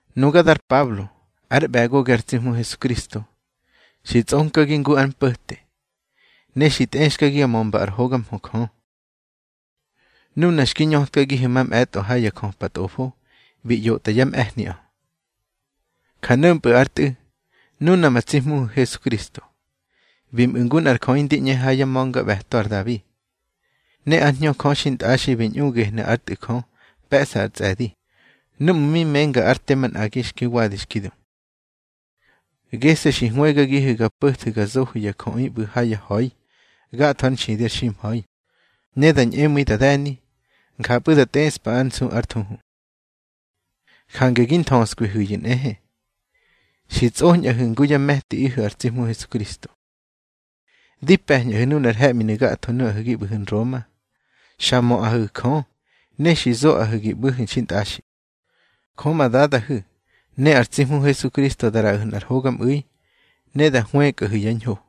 Nuga dar Pablo, ár ꞌbe̱gogi ar tsi Hmu Hesukristo. Xi tsꞌonkagi ngu ár mpo̱te, ne xi tꞌexkagi ga mömba ár hoga mhö Jö. Nuna xki ñötkagihu̱ mamꞌe̱tꞌo ha yá jöpa Tꞌofo bi ꞌyotꞌa yá mꞌe̱hniꞌö. Ja no̱mpꞌu̱ ár Tꞌu̱, nuna ma tsi Hmuhu̱ Hesukristo. Bi mꞌu̱ ngu nꞌar jöꞌi ndi ꞌñe ha yá ma̱ngaꞌbe̱to ar Dabi. Ne ár Hñö Jö xintꞌaxi bi ñꞌu gehnu̱ ár Tꞌu̱ Jö pe̱ꞌsa ár tsꞌe̱di, núꞌmu̱ mi menga ár te manꞌagi xki wadi xki du. Gese̱ xi hwëgagihu̱ ga po̱thu̱ ga zohu̱ ya jöꞌi ꞌbu̱ ha ya ha̱i gatho ár nxidi ar ximha̱i, ne da ñꞌemu̱i da de̱ni, njapꞌu̱ da tꞌeꞌspa ár nsu ár thuhu. Jange gi nthöskwihu̱yu̱ nꞌehe, xi tsꞌoñꞌahu̱ ngu yá me̱tiꞌihu̱ ar tsi Hmu Hesukristo. Di pe̱ñꞌahu̱ nunar he̱ꞌminu̱ gatho nuꞌahu̱ gi ꞌbu̱hu̱ Nroma, xa möꞌahu̱ Jö ne xi zoꞌahu̱ gi ꞌbu̱hu̱ xintꞌaxi. Jö ma Dadahu̱ ne ar tsi Hmu Hesukristo da ꞌraꞌahu̱ nꞌar hogamꞌu̱i, ne da hwëkꞌahu̱ yá ñho.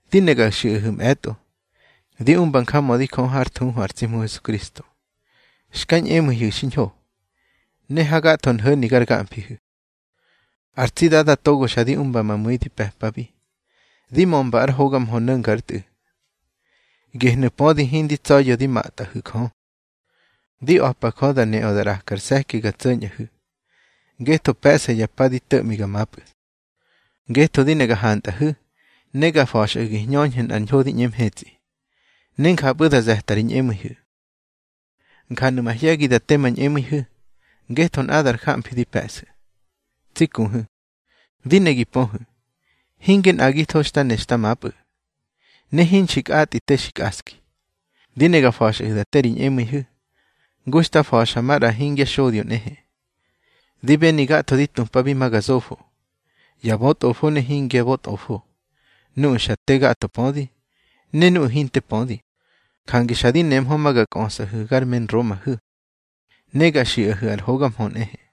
Di ne ga xiꞌahu̱ mꞌe̱tꞌo, di umba njamödi Jö hár thuhu ar tsi Hmu Hesukristo, xka ñꞌemu̱ihu̱ xiñho, ne hagatho nho̱ni gar gamfihu̱. Ar tsi Dada togo xa di umba ma mu̱i di pe̱pabi, di mömba ár hoga mhö no̱nga ár Tꞌu̱, gehnu̱ pödi hindi tsa̱ya̱ di matꞌahu̱ Jö. Di a̱pa Jö da neꞌö da ꞌrakar se̱ki ga tso̱ñꞌahu̱, ngetho pe̱ꞌsa ya pa di to̱ꞌmi ga mapꞌu̱. Ngetho di ne ga hantꞌahu̱ ne ga fa̱xꞌahu̱ gi hñöñhu̱ nꞌar ñho di ꞌñe mhetsꞌi, ne njapꞌu̱ da ze̱ta ri ñꞌemu̱ihu̱. Njanu̱ mahye̱gi da te ma ñꞌemu̱ihu̱, ngetho nꞌadar jamfi di pe̱ꞌsu̱. Tsi kuhu̱, di ne gi pöhu̱, hinge nꞌagitho xta ne xta mapꞌu̱, ne hinxi kꞌatꞌi te xi kꞌaski. Di ne ga fa̱xꞌahu̱ da te ri ñꞌemu̱ihu̱, ngu xta fa̱xa maꞌra hingya xodyo nꞌehe. Di beni gatho di tupabi ma ga zofo, ya bötꞌofo ne hingya bötꞌofo, nuꞌu̱ xa te gatho pödi, ne nuꞌu̱ hinte pödi. Jange xa di nemhö ma ga kꞌösꞌahu̱ gar me Nromahu̱, ne ga xiꞌahu̱ ar hoga mhö nꞌehe.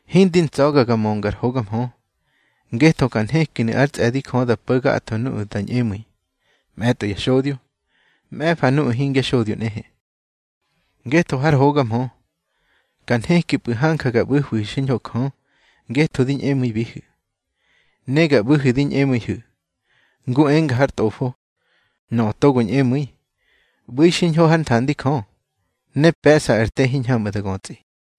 Hindi ntsa̱ga ga mönga ar hoga mhö, ngetho ka nhekinu̱ ár tsꞌe̱di Jö da po̱ gatho nuꞌu̱ da ñꞌemu̱i, mꞌe̱tꞌo ya xodyo, mꞌe̱fa nuꞌu̱ hingya xodyo nꞌehe. Ngetho har hoga mhö, ka nhekipꞌu̱ hanja ga ꞌbu̱hwihu̱ xiñho Jö ngetho di ñꞌemu̱ibihu̱. Ne ga ꞌbu̱hu̱ di ñꞌemu̱ihu̱, ngu enga har Tꞌofo: Nöꞌö togo ñꞌemu̱i, ꞌbu̱i xiñho hár nthandi Jö, ne pe̱ꞌsa ar te hiñhamꞌu̱ da götsꞌi.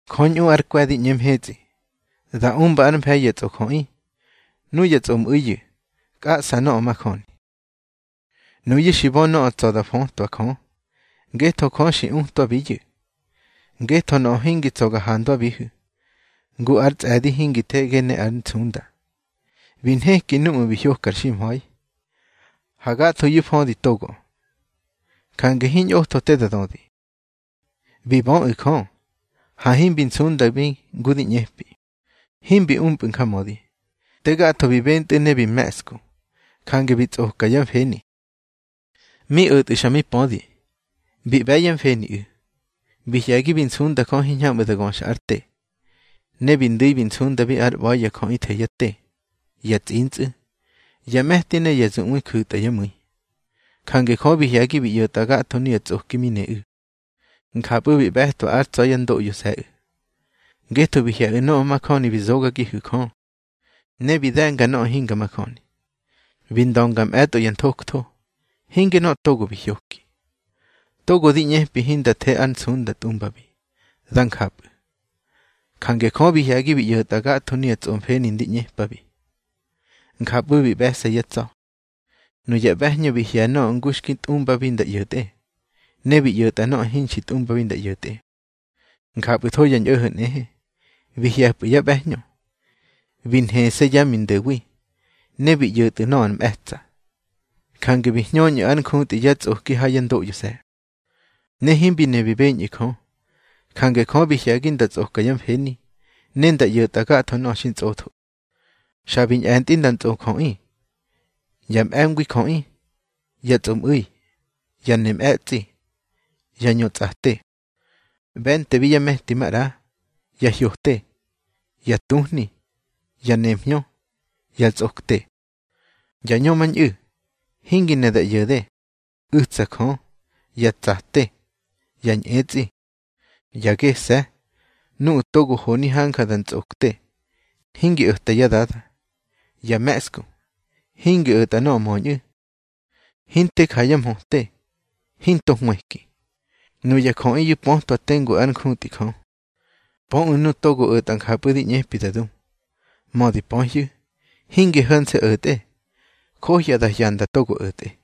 Jö ñꞌu ár kwe̱ di ꞌñe mhetsꞌi, da umba ár mfe̱i ya tsꞌojöꞌi. Nuyá tsꞌoꞌmu̱iyu̱ kꞌaꞌsa nöꞌö majöni. Nuyu̱ xi bö nöꞌö tsa̱ da fötwa Jö, ngetho Jö xi utwabiyu̱. Ngetho nöꞌö hingi tsa̱ ga handwabihu̱, ngu ár tsꞌe̱di hingi thege ne ár nsunda, bi nheki núꞌmu̱ bi hyokar ximha̱i, ha gathoyu̱ födi togoꞌö. Jange hiñꞌotho te da dödi. Bi böꞌu̱ Jö, ha himbi nsundabi ngu ndi ꞌñepi, himbi umpꞌu̱ njamödi. Te gatho bi bentꞌu̱ ne bi me̱ꞌsku, jange bi tsꞌoka yá mfeni. Mi o̱tꞌu̱ xa mi pödi, bi ꞌbe̱ yá mfeniꞌu̱. Bi hye̱gi bi nsunda Jö hiñhamꞌu̱ da göxa ár te. Ne bi ndu̱i bi nsundabi ár ꞌba̱i ya jöꞌi the yá te, ya tsꞌintsꞌu̱, ya me̱ti ne ya zuꞌwe ju̱tꞌa yá mu̱i. Jange Jö bi hye̱gi bi ꞌyo̱tꞌa gatho nuya tsꞌoki mi neꞌu̱. Njapꞌu̱ bi ꞌbe̱twa ár tsa̱ yá ndoꞌyose̱ꞌu̱. Ngetho bi hye̱ꞌu̱ nöꞌö majöni xi zogagihu̱ Jö, ne bi de̱nga nöꞌö hinga majöni. Bi ndönga mꞌe̱tꞌo ya nthojtho, hinge nöꞌö togo bi hyoki, togo di ꞌñepi hinda the ar nsunda tꞌumbabi. Dá njapꞌu̱. Jange Jö bi hye̱gi bi ꞌyo̱tꞌa gatho nuya tsꞌomfeni ndi ꞌñepabi. Njapꞌu̱ bi ꞌbe̱se̱ yá tsa̱. Nuya ꞌbe̱hñö bi hye̱ nöꞌö ngu xki tꞌumbabi nda ꞌyo̱tꞌe, ne bi ꞌyo̱tꞌa nöꞌö hinxi tꞌumbabi nda ꞌyo̱tꞌe. Njapꞌu̱tho ya ñꞌo̱ho̱ nꞌehe, bi hye̱pꞌu̱ yá ꞌbe̱hñö, bi nhese̱ yá mindo̱wi, ne bi ꞌyo̱tꞌu̱ nöꞌö ar mꞌe̱tsa̱. Jange bi hñöñꞌu̱ ár njutꞌi yá tsꞌoki ha yá ndoꞌyose̱. Ne himbi ne bi beñꞌu̱ Jö. Jange Jö bi hye̱gi nda tsꞌoka yá mfeni, ne nda ꞌyo̱tꞌa gatho nöꞌö xi ntsꞌotho. Xa bi ñꞌe̱ntꞌi nda ntsꞌojöꞌi, ya mꞌe̱ngwi jöꞌi, ya tsꞌomꞌu̱i, ya ne mꞌe̱tsꞌi, ya ñö tsꞌate. ꞌBe̱ntebi yá me̱ti maꞌra, ya hyote, ya tuhni, ya nemhñö, ya tsꞌokte; ya ñömañꞌu̱, hingi ne da ꞌyo̱de, u̱tsa Jö, ya tsate, ya ñꞌetsꞌi, ya gese̱, nuꞌu̱ togo honi hanja da ntsꞌokte, hingi o̱ta yá dada; ya me̱ꞌsku, hingi o̱tꞌa nöꞌö möñꞌu̱, hinte ja yá mhöte, hinto hwëki. Nuya jöꞌiyu̱ pötwabi tengu ár njutꞌi Jö, pöꞌu̱ nuꞌu̱ togo o̱tꞌa njapꞌu̱ di ꞌñepi da du. Mödi pöhyu̱, hinge ho̱nse̱ o̱tꞌe, johya da hyanda togo o̱tꞌe.